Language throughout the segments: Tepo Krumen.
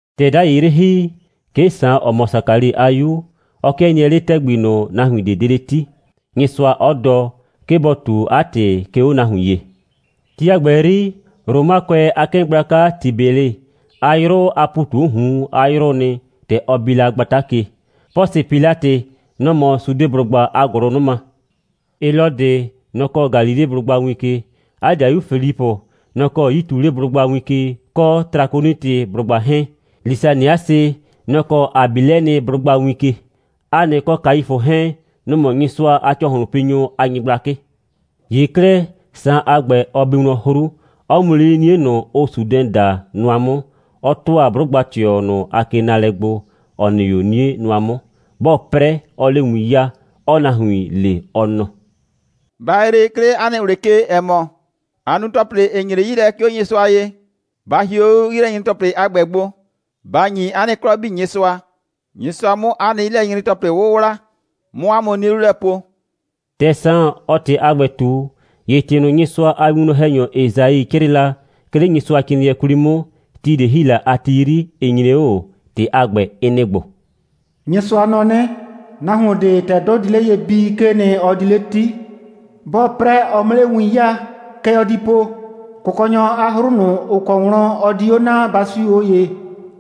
‑Tɛ 'dai 'yrɩ ‑hi, 'ke Saan, ‑ɔ mɔ Sakali a 'yu, ɔ 'kɩɛ nɩɛ 'le ‑tɛgbi ꞊nʋ, nahuin ꞊de 'de 'le 'ti, Nyɩsʋa 'ɔ dɔ, 'ke bɔ ꞊tu 'a ‑tɩ, 'ke 'o nahuin ye. Ti a ‑gbɛ 'yri, Romakʋɛ a 'kɩɩn gblaka Tibɛlɩ, 'a 'yrʋ a ‑pu ꞊tu 'o ꞊hun a 'yrʋʋ nɩ, ‑tɛ ɔ bi la gbata ke. Pʋsɩ Pilatɩ, nɔ‑ mɔ Sudeblʋgba a ‑gʋlʋnʋma. Helɔdɩ, nɔ‑ kɔɔ Galileblʋgba win ke. 'A ‑dɩayu Filipʋ, nɔ‑ kɔɔ Yituleblʋgba win ke, kɔ Trakonitɩblʋgba 'hɛɛn. Lisaniasɩ, nɔ‑ kɔɔ Abilɛnɩblʋgba win ke. Hanɩ kɔ Kaifʋ 'hɛɛn, nʋ‑ mɔ Nyɩsʋa a ‑cɔhlʋnpinyʋ a nyɩgblakɩ. ‑Ye 'klɛɛ, Saan a ‑gbɛ, ɔ bi wlɔn 'hru, 'ɔ mu 'le 'nie ꞊nʋ, ʋʋ Sudɛn daa nʋa 'mʋ, 'ɔ ‑tʋa 'blʋgba꞊tɩɔ ꞊nʋ a kenaalɛ gbo, ‑ɔ nɩ 'o 'nie nʋa 'mʋ. 'Bɔɔ 'prɛ, 'ɔɔ 'le win 'yaa, 'ɔɔ nahuin le, ɔ nɔ: «Ba yree, 'ke 'le 'a nɩ ꞊wlɩ ke, ‑ɛ mɔ, aa nu ‑tɔplɩ, ‑ɩ nyre 'yi lɛ, 'ke 'o Nyɩsʋa ye. Ba hie 'o 'yilɛnyre‑tɔplɩ a ‑gbɛ gbo, ba ‑nyi 'a nɩ 'klɔ 'bii Nyɩsʋa, Nyɩsʋa 'mʋ 'a nɩ 'yilɛnyre‑tɔplɩ 'wʋwla, 'mʋ 'a mʋ 'nie 'lu lɛ po!» ‑Tɛ Saan, ɔɔ ‑tɩ a ‑gbɛ ꞊tu, ‑ye ‑tɩ ꞊nʋ, Nyɩsʋa a winwlɔn‑hɛnyɔ Esai 'crɩɩ la, 'ke 'le Nyɩsʋacrɩɩnɩɛ 'kwli 'mʋ, ti ꞊de ‑hi la a ti 'yri, ɩ nyre 'o ꞊o. ‑Tɩ a ‑gbɛ, ɩ nɩ‑ ‑gbo: «Nyɩsʋa nɔ 'nɩ: Nahuon ꞊de, ‑tɛ 'dʋ di 'le ye bii, 'kee nɩ, ɔ di 'le 'ti. 'Bɔɔ 'prɛ, ɔ 'mʋ 'le win 'yaa. Kɛ ɔ di po: Kʋkɔnyɔ a 'hru ꞊nʋ, ‑ʋ kɔ wlɔn ɔ di 'o na, ba 'siu 'o ye,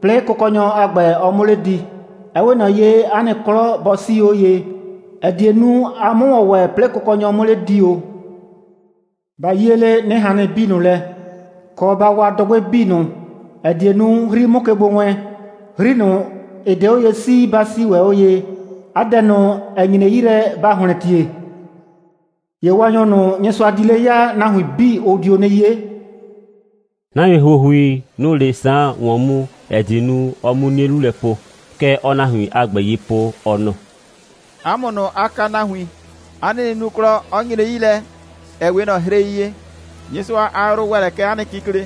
'plɩɩ Kʋkɔnyɔ a ‑gbɛ, ɔ 'mʋ 'le di. Ɛ 'we ꞊nɔ ye, 'a nɩ 'klɔ bɔ 'sii 'o ye, ‑ɛ die nu, a 'mʋ ‑wɔn ‑wɛ, 'plɩɩ Kʋkɔnyɔ 'mʋ 'le di ‑o. Ba 'yie 'le 'nɩhannɩ 'bii ꞊nʋ lɛ, kɔ, ba wa dʋgbɩ 'bii ꞊nʋ, ‑ɛ die nu, 'hri 'mʋ ke gbo wɛɛn. 'Hri ꞊nʋ, ‑ɩ 'de 'o ye 'sii, ba 'sii ‑wɛ 'o ye, 'a dɛ ꞊nʋ, ‑ɛ nyre 'yi lɛ, ba ‑hlɛntie. ‑Ye Waanyɔ ꞊nʋ, Nyɩsʋa di 'le ya, nahuin 'bii, ʋ dio 'nɩ 'ye.» Nahuin ‑huohui, nʋ‑ʋ 'le Saan ‑wɔn mu, ‑ɛ die nu, ɔ 'mu 'nie 'lu lɛ po. Kɛ ɔɔ nahuin a ‑gbɛ ye po, ɔ nɔ: «'A mʋ ꞊nʋ, aa kaa nahuin, 'a nɩ nunuklɔ 'ɔ nyre 'yi lɛ, ‑ɛ 'we ꞊nɔ hrei ye. Nyɩsʋa a yrʋ ‑wɛ lɛ kɛ 'a nɩ kikle.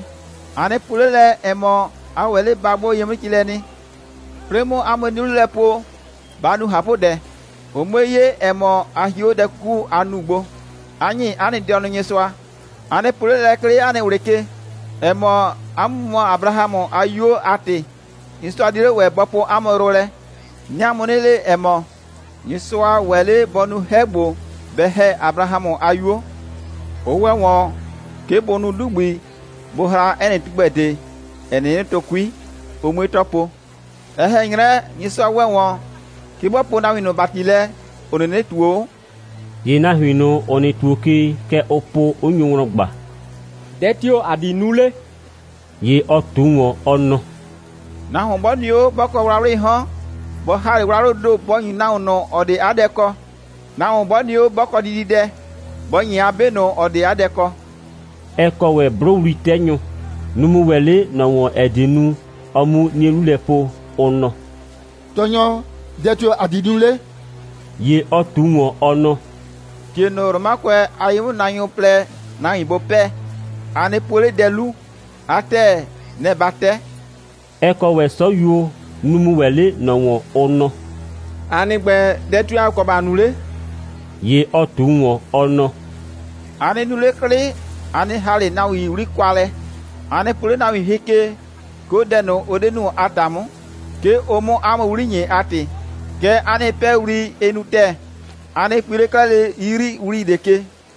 A nɩ po 'le lɛ, ‑ɛ mɔ, a ‑wɛ 'le ba 'gbʋ ye 'mʋ ci lɛ nɩ. 'Plɩɩ 'mʋ 'a mʋ 'nie 'lu lɛ po, ba nu ꞊hapʋdɛ, ʋ 'mue 'ye, ‑ɛ mɔ, a hie 'o dɛ 'kuku, aa nu gbo, 'a ‑nyi 'a nɩ dɩɔnʋ Nyɩsʋa. A nɩ po 'le lɛ, 'ke 'le 'a nɩ ꞊wlɩ ke, ‑ɛ mɔ, 'a mʋ mɔ Abrahamʋ a 'yuo, 'a ‑tɩ, Nyɩsʋa 'die 'le ‑wɛ bɔ poo 'a mʋ yrʋ lɛ. 'Nɩɩ 'a mʋ 'nɩ le, ‑ɛ mɔ, Nyɩsʋa ‑wɛ 'le ꞊le bɔ nu 'hɛ ‑gbo, bɛ ‑hɛ Abrahamʋ a 'yuo. Ʋ ‑wɛ ‑wɔn, 'ke bʋ nu 'dugbi, bʋ hra 'ɛ nɩ tugbɛ ꞊de, ‑ɛ 'nɩnɩ tʋ 'kui, ʋ 'mue 'tɔ po. Ɛ ꞊hɛn 'nyrɛ, Nyɩsʋa ‑wɛ ‑wɔn, 'ke bɔ poo nahuin ꞊nʋ ‑bati lɛ, ‑ʋ 'nɩnɩ ꞊tuo 'o.» ‑Ye nahuin ꞊nʋ, ‑ʋ nɩ ‑tuo ke, kɛ ʋʋ po, 'ʋ nyo wlɔn ꞊gba: «Dɛ tio‑ ‑a di nu 'le?» ‑Ye ɔ ꞊tu ‑wɔn, ɔ nɔ: «Nahuon 'bɔ nɩ 'o, 'bɔ kɔ wlawlɩɩ 'hɔn, bɔ ‑ha 'le wlawlʋʋ ‑do, bɔ ‑nyu nahuon ꞊nʋ, ‑ɔ 'de 'a dɛ kɔ. Nahuon 'bɔ nɩ 'o, 'bɔ kɔ dididɛ, bɔ ‑nyi 'a 'be ꞊nʋ, ‑ɔ 'de 'a dɛ kɔ.» Ɛ kɔ ‑wɛ 'blʋwli'tɛnyʋ. Nʋ‑ mu ‑wɛ 'le ꞊nɔ ‑wɔn, ‑ɛ die nu, ɔ 'mu 'nie 'lu lɛ po, ʋ nɔ: «Tɔɔnyɔ, dɛ tio‑ ‑a di nu 'le?» ‑Ye ɔ ꞊tu ‑wɔn, ɔ nɔ: «‑Tie ꞊nʋ, Romakʋɛ a ye'mʋnaanyʋ plɛ, nahuin bʋ 'pɛɛ, a nɩ pue 'le dɛ 'lu. 'A ‑tɛɛ, nɛ‑ ba 'tɛ.» Ɛ kɔ ‑wɛ 'sɔyuo. Nʋ‑ mu ‑wɛ 'le ꞊nɔ ‑wɔn, ʋ nɔ: «‑A nɩ ‑gbɛ, dɛ tio‑ ‑a kɔ ‑ba nu 'le?» ‑Ye ɔ ꞊tu ‑wɔn, ɔ nɔ: «A nɩ nu 'le 'klɩ, a nɩ ‑ha 'le nahuin 'wli kwa lɛ, A nɩ po 'le nahuin hɩ ke, 'ke 'o dɛ ꞊nʋ, ʋ 'de nu a ‑ta 'mʋ, 'ke ʋ 'mʋ 'a mʋ 'wli ‑nyi a ‑tɩ. Kɛɛ, 'a nɩ 'pɛɛwli, ɩ nu ‑tɛɛ. A nɩ pui 'le 'klɛɛ lele 'yiyriwli ꞊de ke.»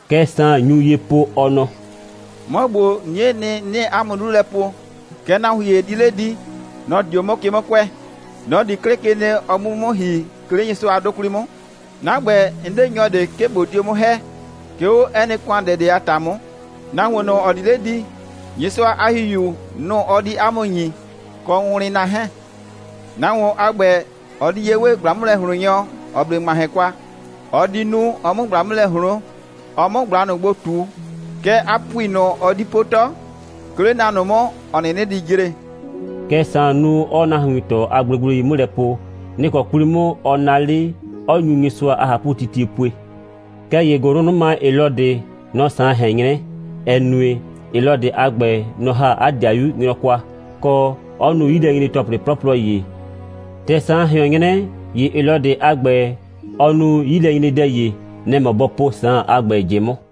Kɛ Saan nyu ye po, ɔ nɔ: «'Mɔ ‑gbo, 'niee nɩ, 'nɩɩ 'a mʋ 'lu lɛ po. Kɛɛ nahuon ‑ye di 'le di. Nɔ‑ di 'o 'mʋ ke 'mʋ kʋɛ. Nɔ‑ di 'klɩ ke nɩ, ɔ 'mʋ 'o 'mʋ 'mʋ ‑hi, 'ke 'le Nyɩsʋa a 'dʋ 'kwli 'mʋ. 'Na ‑gbɛ, 'n 'de nyɔ ꞊de, 'ke ꞊bo dio 'mʋ ‑hɛ, 'ke 'o 'ɛ nɩ ‑kʋandɛ ꞊de a ‑ta 'mʋ. Nahuon ꞊nʋ, ‑ɔ di 'le di, Nyɩsʋa a ‑Hihiu, nʋ‑ ɔ di 'a mʋ ‑nyi kɔ wʋnwlɩnna 'hɛɛn. Nahuon a ‑gbɛ, ɔ di ye 'we ꞊gbla'mʋlɛ꞊hloonnyɔ, ‑ɔ 'ble ‑ŋmahɛn kwa, ɔ di nu, ɔ 'mʋ ꞊gbla 'mʋ lɛ ꞊hloon, ɔ 'mʋ ꞊gbla ꞊nʋ gbo ꞊tu. Kɛɛ, 'a ‑pupui ꞊nʋ, ɔ di po 'tɔ, 'ke 'le na ꞊nʋ 'mʋ, ‑ɔ 'nɩnɩ di jre.» Kɛ Saan nu, 'ɔɔ nahuin ꞊tɔ a gblegblei 'mʋ lɛ po. Nɩ‑ kɔ 'kwli 'mʋ ɔ naa 'le, 'ɔ nyu Nyɩsʋa a ꞊hapʋtitie pue. Kɛɛ ‑ye ‑gʋlʋnʋma Helɔdɩ, nɔ‑ Saan ꞊hɛn 'nyrɛ, ‑ɛ nue, Helɔdɩ a ‑gbɛ, nɔ‑ ‑ha 'a ‑dɩayu nyrɔ kwa, kɔ, 'ɔ nu 'yilɛnyre‑tɔplɩ 'plɔplɔ ‑ye. ‑Tɛ Saan ꞊hɩɔn 'nyrɛ, ‑ye Helɔdɩ a ‑gbɛ, ɔ nu 'yilɛnyredɛ ‑ye. Nɛ‑ mɔ bɔ po Saan a ‑gbɛ ꞊jɩ 'mʋ.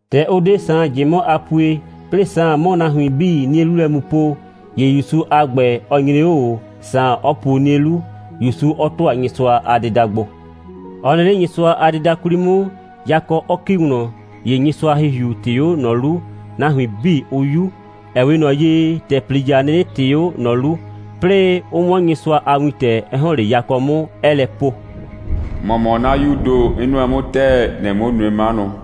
‑Tɛ ʋ 'de Saan ꞊jɩ 'mʋ a pue, 'plɩɩ Saan 'mʋ nahuin 'bii 'nie 'lu lɛ mu po, ‑ye ‑Yusu a ‑gbɛ, ɔ nyre 'o ꞊o, Saan 'ɔ puo 'nie 'lu, ‑Yusu 'ɔ ‑tʋa Nyɩsʋa a dɩda gbo. Ɔ nɩ 'le Nyɩsʋa a dɩda 'kwli 'mʋ, yakɔ 'ɔ ‑ki wlɔn, ‑ye Nyɩsʋa a ‑Hihiu ꞊tɩɩ 'o ꞊nɔ 'lu, nahuin 'bii 'ʋ 'yu. Ɛ 'we ꞊nɔ ye, ‑tɛ ‑plija 'nɩnɩ ꞊tɩɩ 'o ꞊nɔ 'lu, 'plɩɩ 'ʋ 'wɔn Nyɩsʋa a wintɛ, 'ɛ ‑hɔn 'le yakɔ 'mʋ, 'ɛɛ lɛ po: «‑Mɔ mɔ 'na 'Yuu ‑do, 'n nʋɛ 'mʋ ‑tɛɛ. ‑Nɩɩ 'mʋ nue 'manʋ.»